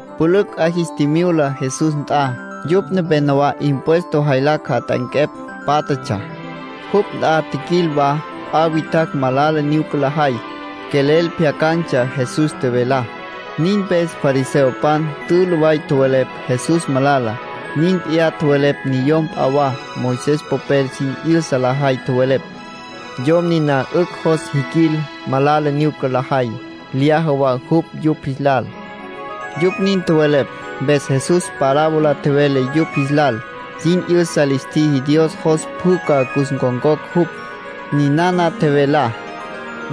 Pülücj 'a jis tjimyula Jesús nt'a. Yupj nepenowá impuesto jaylacj jat'anquepj pátjatsja. Jupj nt'a tjiquil wa p'a witjacj malala nyuca lajay. Quelel pjyacan̈tsja Jesús tjevelá. Nin mpes fariseopan tülü way tjowelepj Jesús malala. Nin p'iyá tjowelepj niyom p'a wa, Moisés popel sin 'yüsa lajay. Tjowelepj: “Yom niná 'ücj jos jiquil malala nyuca lajay. Lyaja wa jupj yupj jis lal.” Yupj nin tjowelepj, mpes Jesús parábola tjevele yupj jis lal. Sin 'yüsa lis tjiji Dios jos pjü ca cus ncon̈cocj jupj. Ninana tjevelá: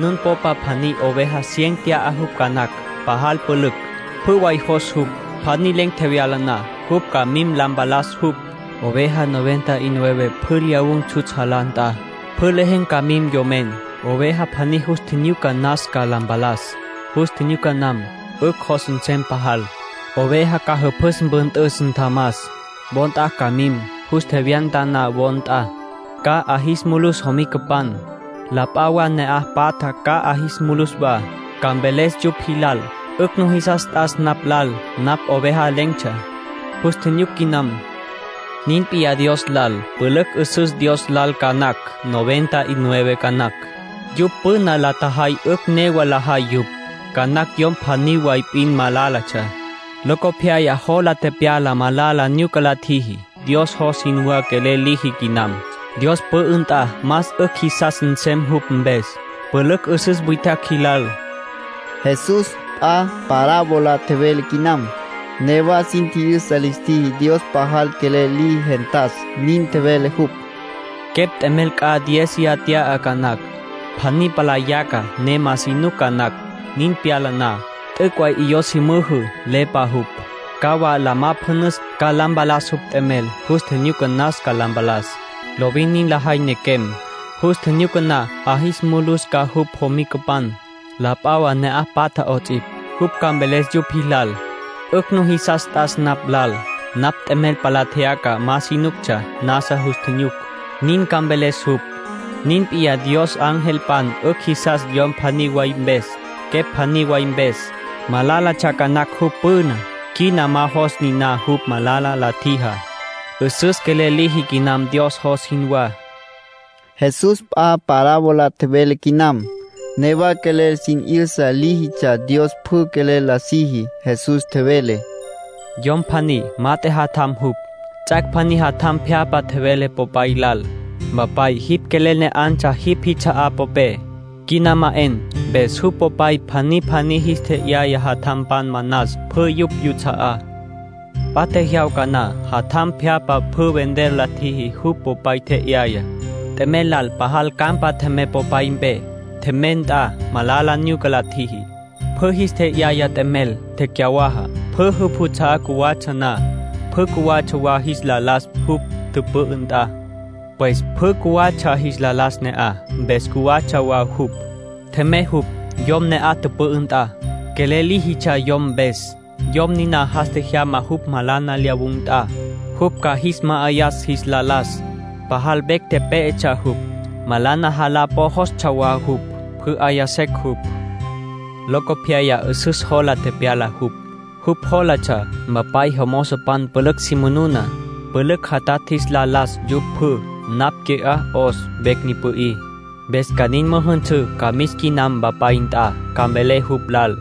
“Nun popa pjaní oveja cien tya'a jupj ca nacj, pajal pülücj. Pjü way jos jupj. Pjaní len̈ tjevyala na, jupj ca mim la mpalas jupj. Oveja noventa y nueve pjü lyawun̈ tsjutsj jalá nt'a. Pjü lejen̈ ca mim yomen. Oveja pjaní jus tjinyuca nas ca la mpalas. Jus tjinyuca nam, 'ücj jos nsem pajal. Oveja ca jüpjüs mpüntüs, ntjamas. Wo nt'a ca mim. Jus tjevyanta na wo nt'a, ca 'a jis mulus jomicapan, la p'a wa ne'aj patja ca 'a jis mulus wa. Ca mveles yupj jilal: ‘'Ücj nujisas t'as napj lal. Napj oveja len̈tsja, jus tjinyuc quinam.’ ”Nin p'iyá Dios lal —tjevele Jesús—. Pülücj 'üsüs Dios lal ca nacj, noventa y nueve ca nacj. Yupj püna la tjajay 'ücj newa lajay yupj. Ca nacj yom pjaní way p'in malálatsja. Locopyaya jola tepyala malala nyuca la tjiji. Dios jos jinwá quelel liji quinam. Dios pü'ü nt'a más 'ücj jisas nsem jupj mpes, pülücj 'üsüs witjacj jilal.” Jesús p'a parábola tjevele quinam. (Newa sin tji'yüsa lis tjiji Dios pajal quelel liji gentas.) Nin tjevele jupj: “Quepj t'emel c'a diéziya tya'a ca nacj. Pjaní palá yaca, ne ma si nuc ca nacj. Nin tepyala na, t'üc' way 'iyó si müjü, lepa jupj. Ca wa la majapjunus, ca la mpalas jupj t'emel. Jus tjinyuca nas ca la mpalas. Lovin nin lajay nequem. Jus tjinyuca na, 'a jis mulus ca jupj jomicapan, la p'a wa ne'aj patja 'ots'ipj. Jupj ca mveles yupj jilal: ‘'Ücj nujisas t'as napj lal. Napj nt'emel palá tjeyaca, ma si nuctsja, nasa jus tjinyuc.’ Nin ca mveles jupj. Nin p'iyá Dios angelpan 'ücj jisas yom pjaní way mpes, quepj pjaní way mpes. Malálatsja ca nacj jupj püná. Quina ma jos niná jupj malala la tjijá; 'üsüs quelel liji quinam Dios jos jinwá.” Jesús p'a parábola tjevele quinam. (Newa quelel sin 'yüsa líjitsja Dios pjü quelel la siji.) Jesús tjevele: “Yom pjaní, mat'e jatjampan jupj. Ts'ac' pjaní jatjam pjyapja tjevele popay lal: ‘Mpapay, jipj quelel ne 'antsja jipj jits'a'á popé, quina ma 'en’. Mpes jupj popay pjaní pjaní jis tje'yaya jatjampan manas pjü yupj yuts'a'á. P'a jyawca na, jatjam pjyapja pjü vender la tjiji jupj popay tje'yayá. T'emel lal pajal campa tjemey popay mpe. Tjemey nt'a malala nyuca la tjiji. Pjü jis tje'yaya t'emel. Tecyawaja. ”Pjü jupj juts'a'á cjuwatsja na, pjü cjuwatsja wa jis la las jupj tüpü'ü nt'a. Pues pjü cjuwatsja jis la las ne'aj. Mpes cjuwatsja wa jupj. Tjemey jupj, yom ne'aj tüpü'ü nt'a. Quelel tsji' líjitsja yom mpes. Yom niná jas tjejyama jupj malana lyawun̈ nt'a, jupj ca jis ma'ayas jis la las. Pajal vecj pé'etsja jupj. Malana jalá po jostsja wa jupj. Pjü 'aya secj yupj. Locopyaya 'üsüs jola tepyala jupj. Jupj jólatsja: ‘Mpapay jomozopan pülücj si manuna. Pülücj jatatj jis la las yupj pjü. Napj qui'á 'os, vecj ni pü'í. Mpes ca nin müjünsǘ, ca mis quinam mpapay nt'a. Ca mvelé jupj lal: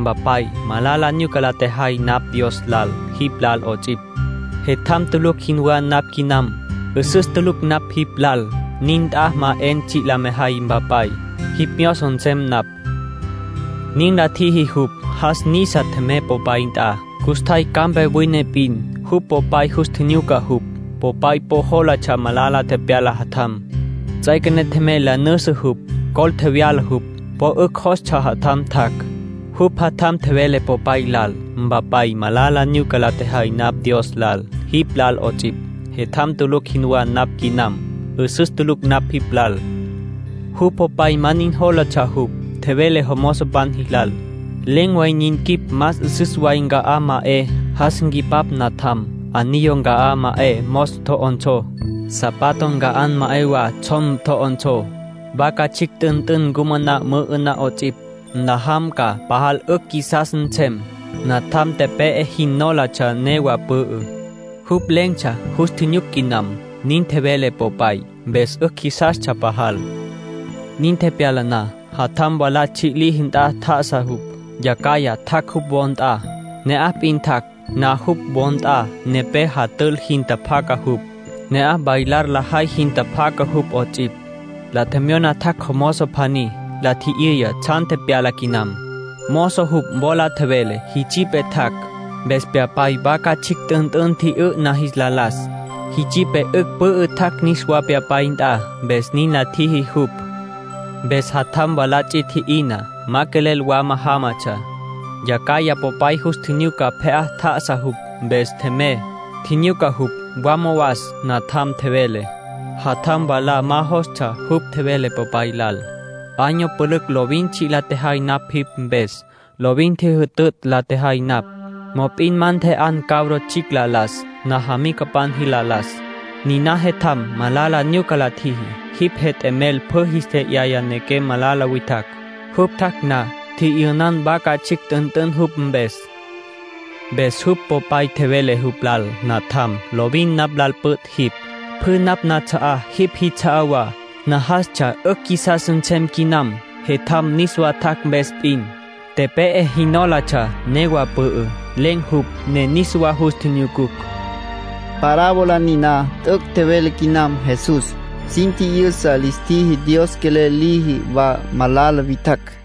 “Mpapay, malala nyuca la tjejay napj Dios lal, jipj lal 'ots'ipj. Jetjam tulucj jinwá napj quinam. 'Üsüs tulucj napj jipj lal. Nin nt'a ma 'en tsji' la mejay, Mpapay. Jipj myozo nsem napj.” ’ Nin la tjiji jupj. Jas nisa, tjemey popay nt'a. ”Custjay campa wine p'in, jupj popay jus tjinyuca jupj. Popay po jólatsja malala tepyala jatjam. Ts'üequené tjemey la nüjüsü jupj. Col tjevyala jupj. Po 'ücj jostsja jatjam tjac'. ”Jupj jatjam tjevele popay lal: ‘Mpapay, malala nyuca la tjejay napj Dios lal, jipj lal 'ots'ipj. Jetjam tulucj jinwá napj quinam. 'Üsüs tulucj napj jipj lal.’ Jupj popay ma nin jólatsja jupj. Tjevele jomozopan jilal: ‘Len̈ way nin quip más 'üsüs way nca'á ma 'e, jas nqui'pá natjam. Anillo nca'á ma 'e, mos tjo'onsó. Zapato nca'á ma 'e wa, tsjom tjo'onsó. Vaca tsjicj t'ünt'ün ncumaná mü'ü'ná 'ots'ipj. Nlajam ca, pajal 'ücj qjuisas nsem. Natjam tepe'e jin nólatsja, newa pü'ü. Jupj len̈tsja; jus tjinyuc quinam.’ Nin tjevele popay, mpes 'ücj jisastsja pajal. ”Nin tepyala na, jatjam mwalá tsji' liji nt'a tjá'asa jupj. Yacjaya tjac' jupj wo nt'a. Ne'aj p'in tjac' na jupj wo nt'a, nepé jatül jin tjapjaca jupj. Ne'aj bailar lajay jin tjapjaca jupj 'ots'ipj. La tjemyona tjac' mozo pjaní, la tji'yüya tsjan tepyala quinam. Mozo jupj wola tjevele: ‘Jitsipe tjac', mpes pyapay vaca tsjicj t'ünt'ün tji'yü'na jis la las. Jitsipe 'ücj pü'ü tjac' niswá pyapay nt'a, mpes nin la tjiji jupj.’ ”Mpes jatjam mwalá ts'i tji'ina. Ma quelel wama jámatsja. Yacjaya popay jus nleya pje'á tjá'asa jupj, mpes tjemey, tjinyuca jupj. ‘Wama was, Natjam’, tjevele. Jatjam mwalá ma jostsja. Jupj tjevele popay lal: ‘Año pülücj lovin tsji' la tjejay napj jipj mpes. Lovin ntjijütütj la tjejay napj. Mop'in ma ntje'an cabro tsjicj la las, najamicapan jilal la las. Niná jetjam, malala nyuca la tjiji. Jipj jet'emel pjü jis tje'yaya nequem malala witjacj. Jupj tjac' na, tji'yünan vaca tsjicj t'ünt'ün jupj mpes.’ Mpes jupj popay tjevele jupj lal: ‘Natjam, lovin napj lal püt' jipj. Pjü napj nats'a'á jipj jits'a'á wa. Najastsja 'ücj qjuisas nsem quinam jetjam niswá tjac' mpes p'in. Tepe'e jin nólatsja, newa pü'ü. Len̈tsja jupj, ne niswa jus tjinyucucj.’” (Parábola niná t'üc' tjevele quinam Jesús. Sin tji'yüsa lis tjiji Dios quelel liji wa malala witjacj.)